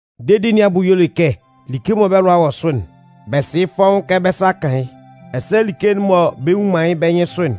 Dedi nɩn abʋ y'ɔ le kɛ like mɔ bɛ́ lʋa wɔ sʋ'n, bɛ sɩ yɩ́ fɔ́ʋ́n kɛ bɛ́ sa 'kan yɩ́. Ɛsɛ like'n mɔ bɛ nnwun man yɩ́ bɛ́ nyɩnsʋ'n,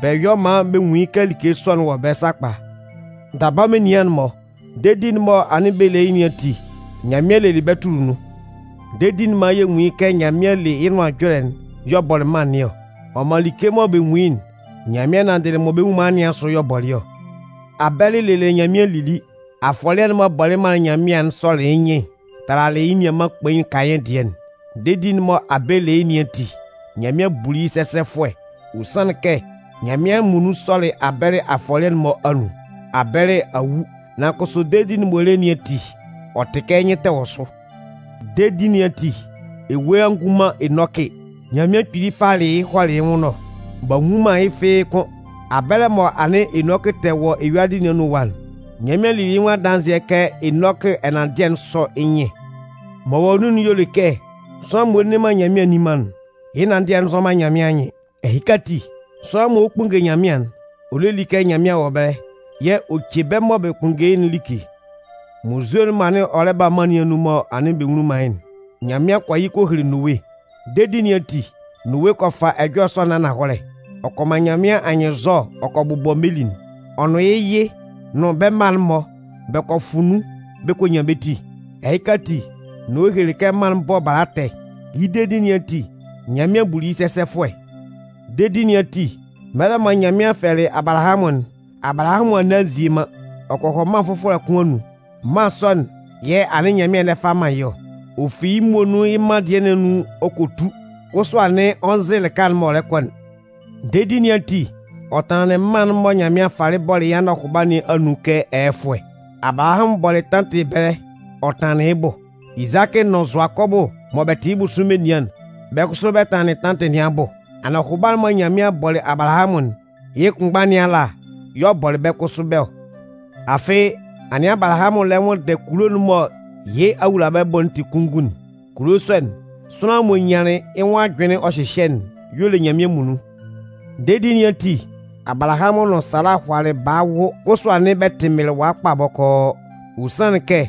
bɛ yɔ maan bɛ nwun yɩ́ kɛ like sɔ'n wɔ ɛbɛlɛ sakpa. Daba menian'n-mɔ dedi'n mɔ anɩn bɛ le yɩ́ nɩn ati, Nyanmɩan lelɩ bɛ́ tʋlɩ nun. Dedi'n man yɛ nwun yɩ́ kɛ Nyanmɩan le yɩ́ Nʋan Ɛjɔlɛ'n y'ɔ bɔlɩ mân nɩn ɔ. Ɔ man like mɔ bɛ nwun yɩ́'n, Nyanmɩan nanndɩlɩ mɔ bɛ nnwun man yɩ́ nɩn asʋ y'ɔ bɔlɩ ɔ. Abɛlɩ lelɩ Nyanmɩan lili. Afɔlɩɛ'n m'ɔ bɔlɩ manlɩn Nyanmɩan'n sɔlɩ yɩ́ nyɩn talalɩ yɩ́ nianman kpain Kayɩn dɩɛ'n. Dedi'n mɔ Abɛlɩ le yɩ́ nɩn ati, Nyanmɩan buli yɩ́ sɛsɛfʋɛ. Ɔ sanlɩn kɛ Nyanmɩan muonun sɔlɩ Abɛlɩ afɔlɩɛ'n-mɔ anun. Abɛlɩ a wu. Nan kʋsʋ dedi'n m'ɔ le yɩ́ nɩn ati, ɔ tɩ kɛ yɩ́ nyɩn tɛ wɔ sʋ. Dedi nɩn ati, ewue a ngu man Enɔkɩ. Nyanmɩan kpili falɩ yɩ́ hɔlɩ yɩ́ nwʋn ɛlɔ. B'a nnwun man yɩ́ fɩ́ɩ́ kʋ́n. Abɛlɛ mɔ anɩn Enɔkɩ tɛ wɔ eyuadɩ nɩn anun ɛwa'n, Nyanmɩan lili yɩ́ nwʋn adanzɩɛ kɛ Enɔkɩ ɛnanndɩɛ'n sɔ yɩ́ nyɩn. M'ɔ wɔ nun'n y'ɔ le kɛ sʋanlan m'ɔ nne man Nyanmɩan nni man'n, yɩ́ ɛnanndɩɛ'n nzɔ man Nyanmɩan anyɩn. Ɛhɩka ati, sʋanlan mɔ ɔ 'kpunnge Nyanmɩan'n, ɔ lé lí kɛ Nyanmɩan wɔ ɛbɛlɛ yɛ̂ ɔ ce bɛ́ mɔ bɛ kpʋnndɛ yɩ́'n like. Munnzue'n m'ɔ lɛ ba tɔ mân nɩn anun mɔ anɩn bɛ nwunlin man yɩ́'n, Nyanmɩan kɔ yɩ kɔ hele Nowe. Dedi nɩn ati, Nowe kɔ fa ɛjɔlɛ sɔ'n ananhɔlɛ. Ɔ kɔ man Nyanmɩan anyɩnnzɔ ɔ kɔ bʋbɔ meli'n. Ɔ nʋn yɩ́ yɩ nʋn bɛ́ mma'n-mɔ bɛ kɔ fʋ nun bɛ kɔ nyan bɛ́ ti. Ɛhɩka ati, Nowe helelɩ kɛ mân'n bɔ bala ɛtɛ. Yɩ́ dedi nɩn ati, Nyanmɩan buli yɩ́ sɛsɛfʋɛ. Dedi nɩn ati, mɛlɛ mɔ Nyanmɩan fɛlɛlɩ Abalahamʋn'n, Abalahamʋn a nne a nzie man. Ɔ kɔ hɔ mân fʋfɔlɛ kʋn anun. Mân sɔ'n yɛ̂ anɩn Nyanmɩan lɛ ba fa man yɩ́ ɔ. Ɔ fi yɩ́ muonun yɩ́ mân dɩɛ nɩn anun ɔ kɔ tu kʋsʋ anɩn ɔ nzɩ lɩka'n m'ɔ lɛ kɔ'n. Dedi nɩn ati, ɔ tanlanlɩn mân'n mɔ Nyanmɩan falɩ bɔlɩ yɩ́ anɔhʋba nɩn anun kɛ ɛyɛfʋɛ. Abalahamʋn bɔlɩ tantɩ ɛbɛlɛ ɔ tanlanlɩn yɩ́ bʋ. Izakɩ nʋn Zʋakɔbʋ mɔ bɛ tɩ yɩ́ bʋsʋ menian'n, bɛ́ kʋsʋ bɛ tanlanlɩn tantɩ nɩn abʋ. Anɔhʋba'n mɔ Nyanmɩan bɔlɩ Abalahamʋn'n, yɩ́ kpʋnmgba nɩn ala y'ɔ bɔlɩ bɛ́ kʋsʋ bɛ́ ɔ. Afɩ anɩn Abalahamʋn lɛ nwʋnndɛ kulo'n mɔ yɩ́ awulabɛbʋ'n tɩ kunngun'n. Kulo sɔ'n, sʋanlan m'ɔ nyanlɩn yɩ́ nwʋn ajʋnlɩn ɔ hyɩhyɛ'n y'ɔ le Nyanmɩan muonun. Dedi nɩn ati, Abalahamʋn nʋn Sala hʋalalɩ baa wʋ kʋsʋ anɩn bɛ tɩ mɩlɩwa kpa bɔkɔɔ. Ɔ sanlɩn kɛ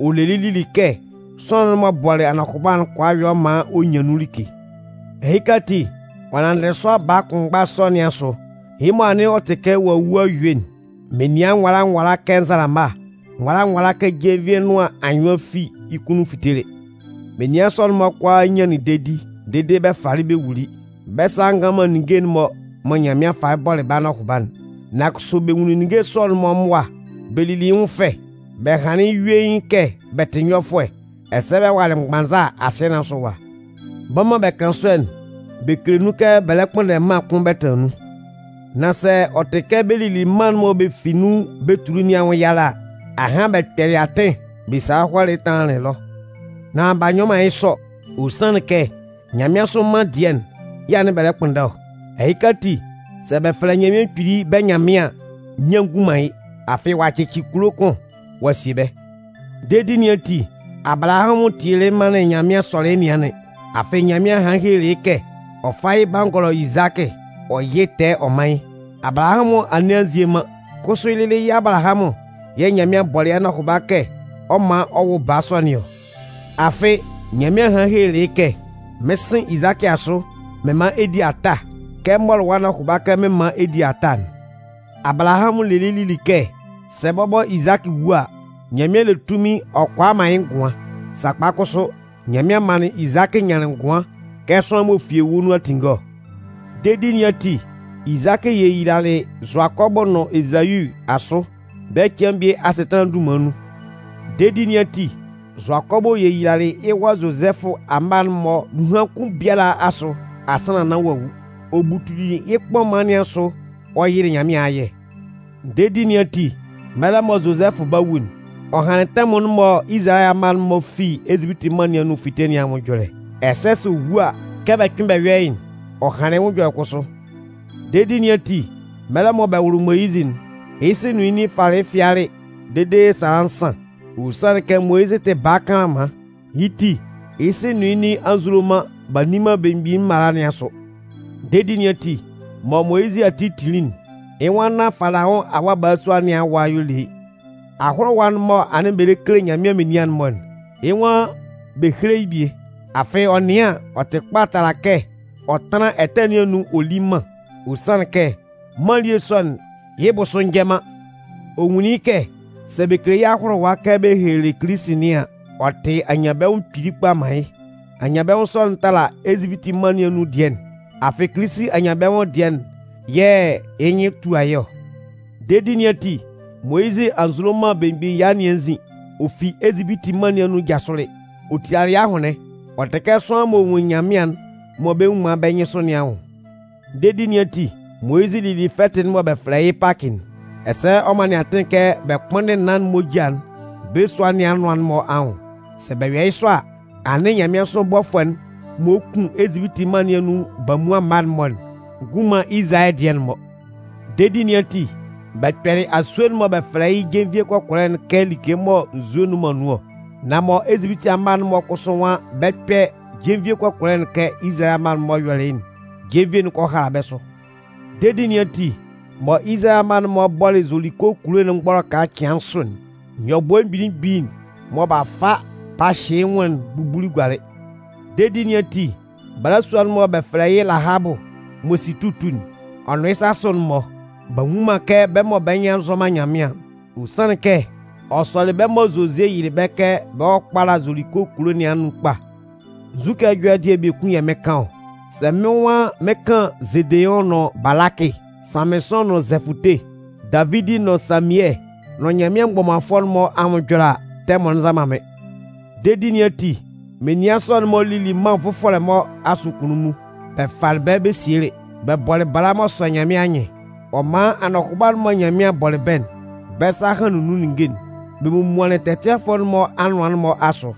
ɔ lelɩ lili kɛ sʋanlan'n m'ɔ bɔlɩ anɔhʋba'n kʋala yɔ maan ɔ nyan nun like. Ɛhɩka ati, ɔ nanndɩ sʋanlan baa kʋnmgba sɔ nɩn asʋ, yɩ́ mɔ anɩn ɔ tɩ kɛ ɔ'a wu a yue'n, menian nwala nwala kɛ nzalama, nwala nwala kɛ jenvie nʋan anyʋan fi yɩ́ kunnun fitelɩ. Menian sɔ'n-mɔ kʋalaa nyanlɩn dedi dede bɛ falɩ bɛ wuli. Bɛ́ sa a ngan man ninnge'n-mɔ mɔ Nyanmɩan falɩ bɔlɩ bɛ́ anɔhʋba'n. Nan kʋsʋ bɛ nwunlin ninnge sɔ'n-mɔ mʋa bɛ lili yɩ́ nwʋn fɛ. Bɛ hanlɩn yɩ́ yuein kɛ bɛ tɩ nyɔfʋɛ, ɛsɛ bɛ walɩ mgbanza asɩɛ nɩn asʋ ɛwa. Bɛ́ mɔ bɛ kan sɔ'n, bɛ kele nun kɛ bɛ lɛ kpʋnndɛ mân kʋn bɛ tanlan nun. Nan sɛ ɔ tɩ kɛ bɛ lili mân'n mɔ bɛ fi nun bɛ tuli nɩn anwʋn yalɛ a, ahan bɛ kpɛlɩ atɩn bɛ salɩ hɔlɩ tanlanlɩn ɛlɔ. Nan b'a nyɔ man yɩ́ sɔ. Ɔ sanlɩn kɛ nyanmɩansʋ mân dɩɛ'n yɛ̂ anɩn bɛ lɛ kpʋnndɛ ɔ. Ɛhɩka ati, sɛ bɛ fɛlɛ Nyanmɩan Kpili bɛ́ Nyanmɩan an, nyian ngun man yɩ́. Afɩ ɔ'a cɩcɩ kulo kʋn ɔ'a sie bɛ́. Dedi nɩn ati, Abalahamʋn tielɩ manlɩn Nyanmɩan sɔlɩ yɩ́ nɩanlɩn. Afɩ Nyanmɩan hanlɩn helelɩ yɩ́ kɛ ɔ fá yɩ́ bangɔlɔ Izakɩ ɔ yɩ́ tɛɛ ɔ mán yɩ́. Abalahamʋn a nne a nzie man. Kʋsʋ yɩ́ lɩlɩ yɩ́ Abalahamʋn yɛ̂ Nyanmɩan bɔlɩ yɩ́ anɔhʋba kɛ ɔ 'man ɔ wʋ baa sɔ nɩn ɔ. Afɩ, Nyanmɩan hanlɩn helelɩ yɩ́ kɛ: Mɩn 'sɩn Izakɩ asʋ mɩn man ɛ di ata kɛ m mɔlɩ wɔ́ anɔhʋba kɛ mɩn 'man ɛ di ata'n. Abalahamʋn lelɩ lili kɛ sɛ bɔbɔ Izakɩ wu a, Nyanmɩan le tunmin ɔ kʋala ɔ man yɩ́ ngʋan. Sakpa kʋsʋ, Nyanmɩan manlɩn Izakɩ nyanlɩn ngʋan kɛ sʋanlan m'ɔ fi ewue nun a tinnge ɔ. Dedi nɩn ati, Izakɩ yeyilalɩ Zʋakɔbʋ nʋn Ezau asʋ bɛ́ cɩan bie asɩtanlan'n dunman nun. Dedi nɩn ati, Zʋakɔbʋ yeyilalɩ yɩ́ wa Zozɛfʋ amma'n-mɔ nunhan kʋn biala asʋ asannan nán ɔ'a wu. Ɔ butuli yɩ́ kpɔman nɩn asʋ ɔ yɩlɩ Nyanmɩan ayɛ. Dedi nɩn ati, mɛlɛ mɔ Zozɛfʋ 'ba wu'n, ɔ hanlɩn tɛmʋn'n mɔ Izalayɛ amma'n-mɔ fi Ezipiti mân nɩn anun 'fite nɩn anwʋn ɛjɔlɛ. Ɛsɛ sɛ ɔ wu a, kɛ bɛ kpɩ́n bɛ yɔ́ yɩ́'n, ɔ hanlɩn yɩ́ nwʋn ɛjɔlɛ kʋsʋ. Dedi nɩn ati, mɛlɛ mɔ bɛ wʋlɩ Moyizɩ'n, yɩ́ sɩ nʋn yɩ́ nin falɩ yɩ́ fɩalɩ dede sala nsan. Ɔ sanlɩn kɛ Moyizɩ tɩ baa kanlanman. Yɩ́ ti, yɩ́ sɩ nʋn yɩ́ nin a nzulo man b'a nni man belemgbin'n mala nɩn asʋ. Dedi nɩn ati, mɔ Moyizɩ ati tinlin'n, yɩ́ nwan nán Falaʋn awa balasua nɩn awa y'ɔ le yɩ́. Ahʋlʋwa'n mɔ anɩn bɛ lɛ kele Nyanmɩan menian'n-mɔ'n, yɩ́ nwan bɛ héle yɩ́ bie. Afɩ ɔ nɩan an, ɔ tɩ kpa tala kɛ ɔ tánlan ɛtɛ nɩn anun ɔ lí mân. Ɔ sanlɩn kɛ mân elie sɔ'n yɩ́ bʋsʋ njɛ man. Ɔ nwunlin yɩ́ kɛ sɛ bɛ kele yɩ́ ahʋlʋwa kɛ bɛ helelɩ Kilisi nɩn an, ɔ tɩ anyanbɛnwʋn kpili kpa man yɩ́. Anyanbɛnwʋn sɔ'n tala Ezipiti mân nɩn anun dɩɛ'n. Afɩ Kilisi anyanbɛnwʋn dɩɛ'n yɛ̂ yɩ́ nyɩn tua yɩ́ ɔ. Dedi nɩn ati, Moyizɩ a nzulo man belemgbin ɛya nɩn anzin. Ɔ fi Ezipiti mân nɩn anun jasʋlɩ. Ɔ tilalɩ yɩ́ ahʋnlɩn. Ɔ tɩ kɛ sʋanlan m'ɔ nwun Nyanmɩan'n mɔ bɛ nnwun man yɩ́ bɛ́ nyɩnsʋ nɩn anwʋn. Dedi nɩn ati, Moyizɩ lili fɛtɩ'n mɔ bɛ fɛlɛ yɩ́ Pakɩ'n. Ɛsɛ ɔ manlɩn atɩn kɛ bɛ kpʋ́nndɩn naan'n moja'n bɛ́ sua nɩn anʋan'n-mɔ anwʋn. Sɛ bɛ yɔ yɩ́ sɔ a, anɩn nyanmɩansʋ bɔfʋɛ'n mɔ ɔ 'kun Ezipiti mân nɩn anun bamuan mma'n-mɔ'n ngun man Izalayɛ dɩɛ'n-mɔ. Dedi nɩn ati, bɛ kpɛlɩ asue'n mɔ bɛ fɛlɛ yɩ́ jenvie kɔkɔlɛ'n kɛ like mɔ nzue nnʋn man nun ɔ. Nan mɔ Ezipiti amma'n-mɔ kʋsʋ nwan bɛ 'kpɛ jenvie kɔkɔlɛ'n kɛ Izalayɛ amma'n-mɔ yɔlɩ yɩ́'n, jenvie'n kɔ hala bɛ́ sʋ. Dedi nɩn ati, mɔ Izalayɛ amma'n-mɔ bɔlɩ Zoliko kulo'n mgbɔlɔka cɩan nsʋ'n, nyɔbʋɛ mgbili mgbili'n mɔ b'a fa b'a hyɩ yɩ́ nwʋn'n bubuli gualɩ. Dedi nɩn ati, balasua'n mɔ bɛ fɛlɛ yɩ́ Lahabʋ m'ɔ si tutu'n, ɔ nʋn yɩ́ sasʋ'n-mɔ, b'a nwu man kɛ bɛ́ mɔ bɛ́ nyɩn a nzɔ man Nyanmɩan'n. Ɔ sanlɩn kɛ ɔ sɔlɩ bɛ́ mɔ Zozie yɩlɩ bɛ́ kɛ bɛ hɔ́ kpála Zoliko kulo nɩn anun kpa. Nzukɛ ɛjɔlɛ dɩɛ biekun yɛ̂ mɩn 'kan ɔ? Sɛ mɩ́n nwan mɩn 'kan Zedeʋn nʋn Balakɩ, Sanmɩnsʋn nʋn Zɛfʋte, Davidi nʋn Samiɛ nʋn Nyanmɩan mgbɔmanfʋɛ'n-mɔ anwʋn ɛjɔlɛ a, tɛmʋn'n nza man mɩ́n. Dedi nɩn ati, menian sɔ'n-mɔ lili mân nvʋfɔlɛ-mɔ asʋ kunnunmun bɛ falɩ bɛ́ bɛ sielɩ. Bɛ bɔlɩ bala m'ɔ sɔ Nyanmɩan anyɩn. Ɔ man anɔhʋba'n mɔ Nyanmɩan bɔlɩ bɛ́'n, bɛ́ sa hanlɩn nun ninnge'n. Bɛ momuanlɩn tɛtɩanfʋɛ'n-mɔ anʋan'n-mɔ asʋ.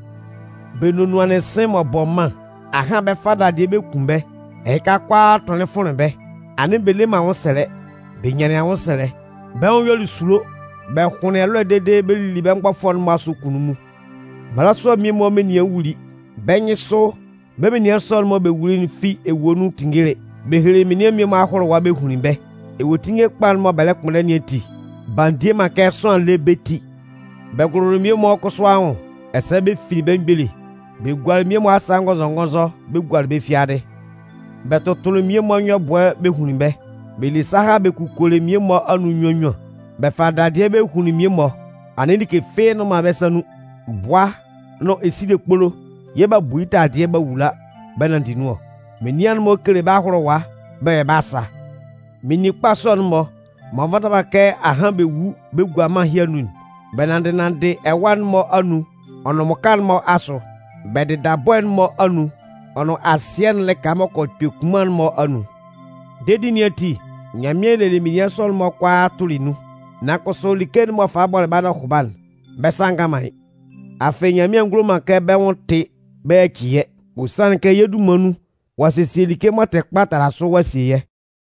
Bɛ nonuanlɩn sɩ̂n m'ɔ bɔ mân. Ahan bɛ 'fa dadɩɛ bɛ kun bɛ́. Ɛhɩ kʋalaa tʋlɩ fʋnlɩn bɛ́. Anɩn bɛ le man anwʋnsɛlɛ. Bɛ nyanlɩn anwʋnsɛlɛ. Bɛ́ nwʋn yɔlɩ esulo. Bɛ hʋnlɩn ɛlɔɛ dede bɛ lili bɛ́ mgbɔfʋɛ'n-mɔ asʋ kunnunmun. Mmalasua mmie-mɔ menian wuli. Bɛ́ nyɩnsʋ, bɛ́ menian sɔ'n-mɔ mɔ bɛ wuli'n fi ewue nun tinngelɩ. Bɛ helelɩ menian mmie-mɔ ahʋlʋwa bɛ hunlin bɛ́. Ewuetinnge kpa'n mɔ bɛ lɛ kpʋnndɛ nɩn ati, b'a ndie man kɛ sʋanlan lé bɛ́ ti. Bɛ gʋlʋlɩ mmie-mɔ kʋsʋ anwʋn ɛsɛ bɛ finlin bɛ́ mgbele. Bɛ gualɩ mmie-mɔ asa ngɔnzɔngɔnzɔ bɛ gualɩ bɛ́ fiadɩ Bɛ tʋtʋlɩ mmie-mɔ nyɔbʋɛ bɛ hunlin bɛ́. Bɛ le saha bɛ kukolɩ mmie-mɔ anun nnyuan nnyuan. Bɛ falɩ dadɩɛ bɛ hunlin mmie-mɔ. Anɩn like fɩ́ɩ́ nnʋn bɛ́ sa nun. Bʋa nʋn esile kpolo yɛ̂ b'a bu yɩ́ taladɩɛ b'a wula bɛ nanndɩ nun ɔ. Menian'n-mɔ kele bɛ́ ahʋlʋwa bɛ yɔ bɛ́ asa. Meninkpa sɔ'n-mɔ m'ɔ nvata man kɛ ahan bɛ wu bɛ gua mân ɛhɩ anun'n, bɛ nanndɩ nanndɩ ɛwâ'n-mɔ anun ɔ nʋn mmʋka'n-mɔ asʋ. Bɛ dɩda bɔɛ'n-mɔ anun ɔ nʋn asɩɛ'n lɩka m'ɔ kɔ kpɛ kunman'n-mɔ anun. Dedi nɩn ati, Nyanmɩan lelɩ menian sɔ'n-mɔ kʋalaa tʋlɩ nun. Nan kʋsʋ, like'n m'ɔ falɩ bɔlɩ bɛ́ anɔhʋba'n, bɛ́ sa a ngan man yɩ́. Afɩ Nyanmɩan a ngulo man kɛ bɛ́ nwʋn tɩ bɛ yaci yɛ́. Ɔ sanlɩn kɛ yɛ́ dunman nun, ɔ'a sesie like m'ɔ tɩ kpa tala sʋ ɔ'a sie yɛ́.